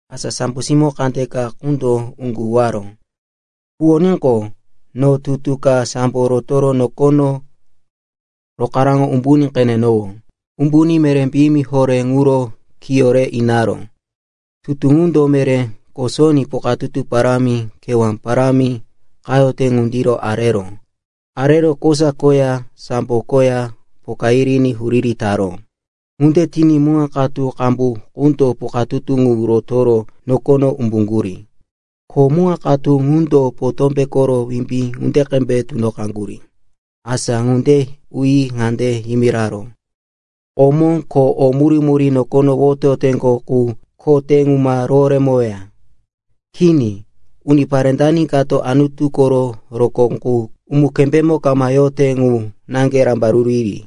Asa sambo simó kandeka qundo uŋgu huwaró. Huwoníqo, no tutu ka sambo rotoro nokono rokaraŋo umbuní qenenowó. Umbuní meré piyimi horé ŋuro kiyó re inaró. Tutu ŋundo meré kosoní pukatutu parámi, kewá parámi qayote ŋundiro areró. Arero kosa koya sambo koya poka yiriní huriri taró. Ŋunde tiní muŋa katu qambu qundo pukatutu ŋu rotoro nokono umbuŋgurí. Ko muŋa katu ŋundo potómbe koro wimbí ŋunde qembe tunoqaŋgurí. Asa ŋunde uyi ŋande yimiraró, “Komó ko o murí-murí nokono woteyoteŋgo qu ko te ŋu ma roworemoweya. Kini, unipare dani kato Anutu koro rokó qu umu-kembayemo kama yote ŋu naŋge rambaruru yiri.”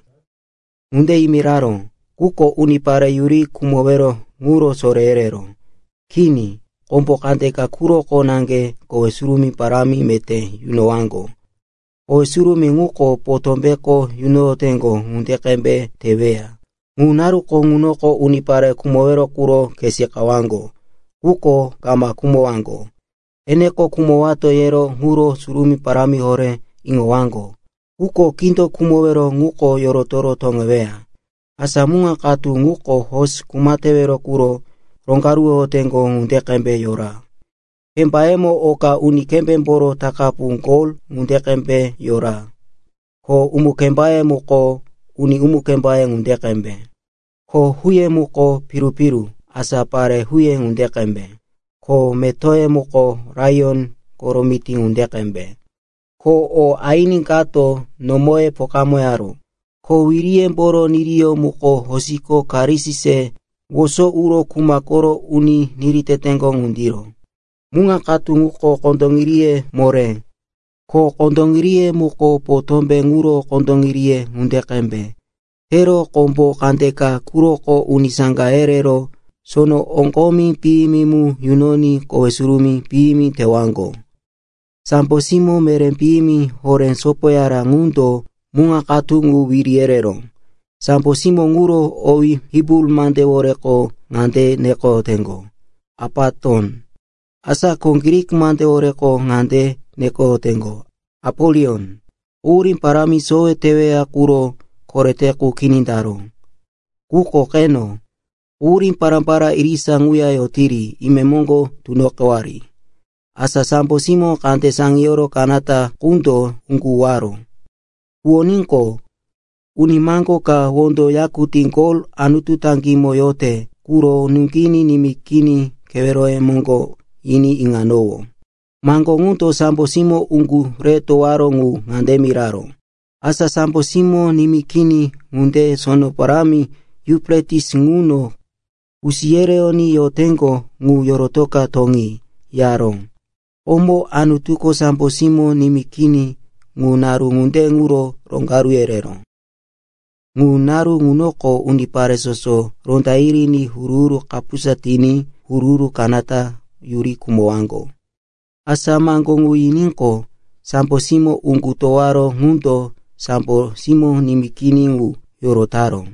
Ŋunde yimiraró, quko unipare yuri khumowero ŋuro soré yereró. Kini, kombo kandeka quroko naŋge kowe surumí parámi meté yunowaŋgo, kowe surumí ŋuko potómbeko yunoyoteŋgo ŋunde qembe teweya. Ŋu naru ŋunoko unipare khumowero quro khe seqawaŋgo, quko kama khumowaŋgo. Eneko khumowato yero ŋuro surumí parámi horé iŋowaŋgo, quko kindo khumowero ŋuko yorotoro toŋeweya. Asa muŋa katu ŋuko hosi kuma tewero quro roŋgaruwoyoteŋgo ŋunde qembe yora. Kembayemo oka uni kembémboro takapu gol ŋunde qembe yora. Ko umu-kembaye muko uni umu-kembaye ŋunde qembe. Ko huye muko piru-piru, asa pare huye ŋunde qembe. Ko metoye muko laiyon koro mití ŋunde qembe. Ko o aini kato nomoye pokamoyaró, ko wireyemboro niriyó muko hosiko karis se woso uro kuma koro uro niri teteŋgo ŋundiro. Muŋa katu ŋuko kondoŋiriye moré. Ko kondoŋiriye muko potómbe ŋuro kondoŋiriye ŋunde qembe tero kombo kandeka quroko uni saŋga yerero sono oŋgomi piyimi mu yunoyi kowe surumí piyimi tewaŋgo. Sambo simó meré piyimi horé sopoyara ŋundo muŋa katu ŋu wiri yereró. Sambo simó ŋuro owí Hibru mandeworeko ŋande nekoyoteŋgo, “Apaton.” Asa ko Grik mandeworeko ŋande nekoyoteŋgo, “Apolion.” Quhurí parámi sowe teweya quro korete qu kini taró. Quko qeno, quhurí pará-pará irisa ŋuya yotiri, imemoŋgo tunoqewari. Asa sambo simó kande saŋiyoro kanata qundo uŋgu huwaró. Huwoníqo, uni maŋgó ka wondo yakutí gol Anutu toŋímo yote quro nuŋginí nimí kini keweroye moŋgo yiní iŋanowó. Maŋgo ŋundo sambo simó uŋgu re towoyaró ŋu ŋande miraró, “Asa sambo simó nimí kini ŋunde sono parámi Yufretis ŋuno kusi yereyoní yoteŋgo ŋu yorotoka toŋi,” yaró. Komo Anutuko sambo simó nimí kini ŋu naru ŋunde quro roŋgaru yereró. Ŋu naru ŋunoko unipare soso ronda yiriní huru-huru kapusa tiní huru-huru kanata yuri khumowaŋgo. Asa maŋgo ŋu yiníqo, sambo simó uŋgu towoyaró ŋundo sambo simó nimí kini ŋu yorotaró.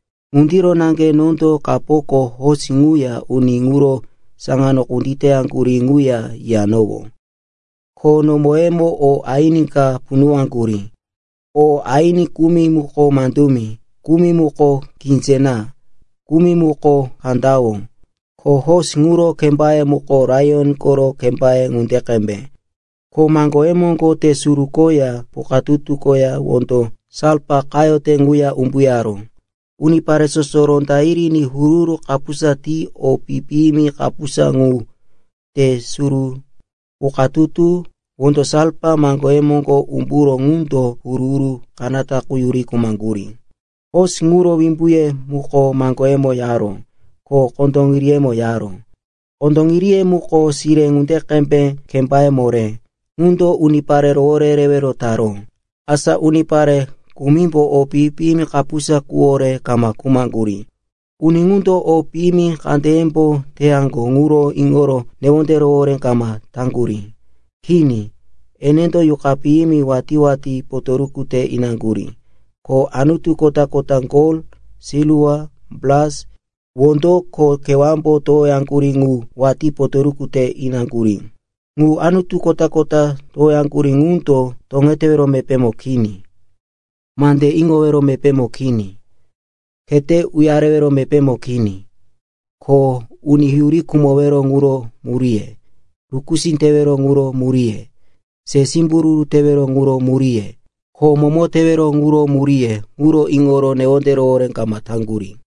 Ŋundiro naŋge nondo kapoko hosi ŋuya uni ŋuro saŋano kunditeyaŋgurí ŋuya yiyanowó, ko nomoyemo o aini ka punuwaŋgurí. O aini kumi muko mandumi, kumi muko kinzé na, kumi muko kandawó. Ko hosi ŋuro kembaye muko laiyon koro kembaye ŋunde qembe. Ko maŋgoye moŋgo te suru koya pukatutu koya wondo salfa qayote ŋuya umbuyaró. Unipare soso rondaŋiní huru-huru kapusa ti o pi-piyimi kapusa ŋu, te suru, pukatutu, wondo salfa maŋgoye moŋgo umburó ŋundo huru-huru kanata qu yuri khumaŋgurí. Hosi ŋuro wimbuye muko maŋgoyemo yaró, ko kondoŋiriyemo yaró. Kondoŋiriye muko sire ŋunde qembe kembaye moré, ŋundo unipare rowore yerewero taró. Asa unipare kumimbo o pi-piyimi kapusa quwore kama khumaŋgurí. Uni ŋundo o piyimi kandeyembo teyaŋgo ŋuro iŋoro newonde rohoré kama taŋgurí. Kini, enendo yuqa piyimi watí-watí potoruku te inaŋgurí. Ko anutu kota-kota gol, silwa, bras, wondo ko kewámbo towoyaŋgurí ŋu watí potoruku te inaŋgurí. Ŋu anutu kota-kota towoyaŋgurí ŋundo toŋetewero mepémo kini, mande iŋowero mepémo kini, khete uyarewero mepémo kini. Ko uni yuri khumowero ŋuro muríye, rukusí tewero ŋuro muríye, se simbururu tewero ŋuro muríye, ko momo tewero ŋuro muríye ŋuro iŋoro newonde rohoré kama taŋgurí.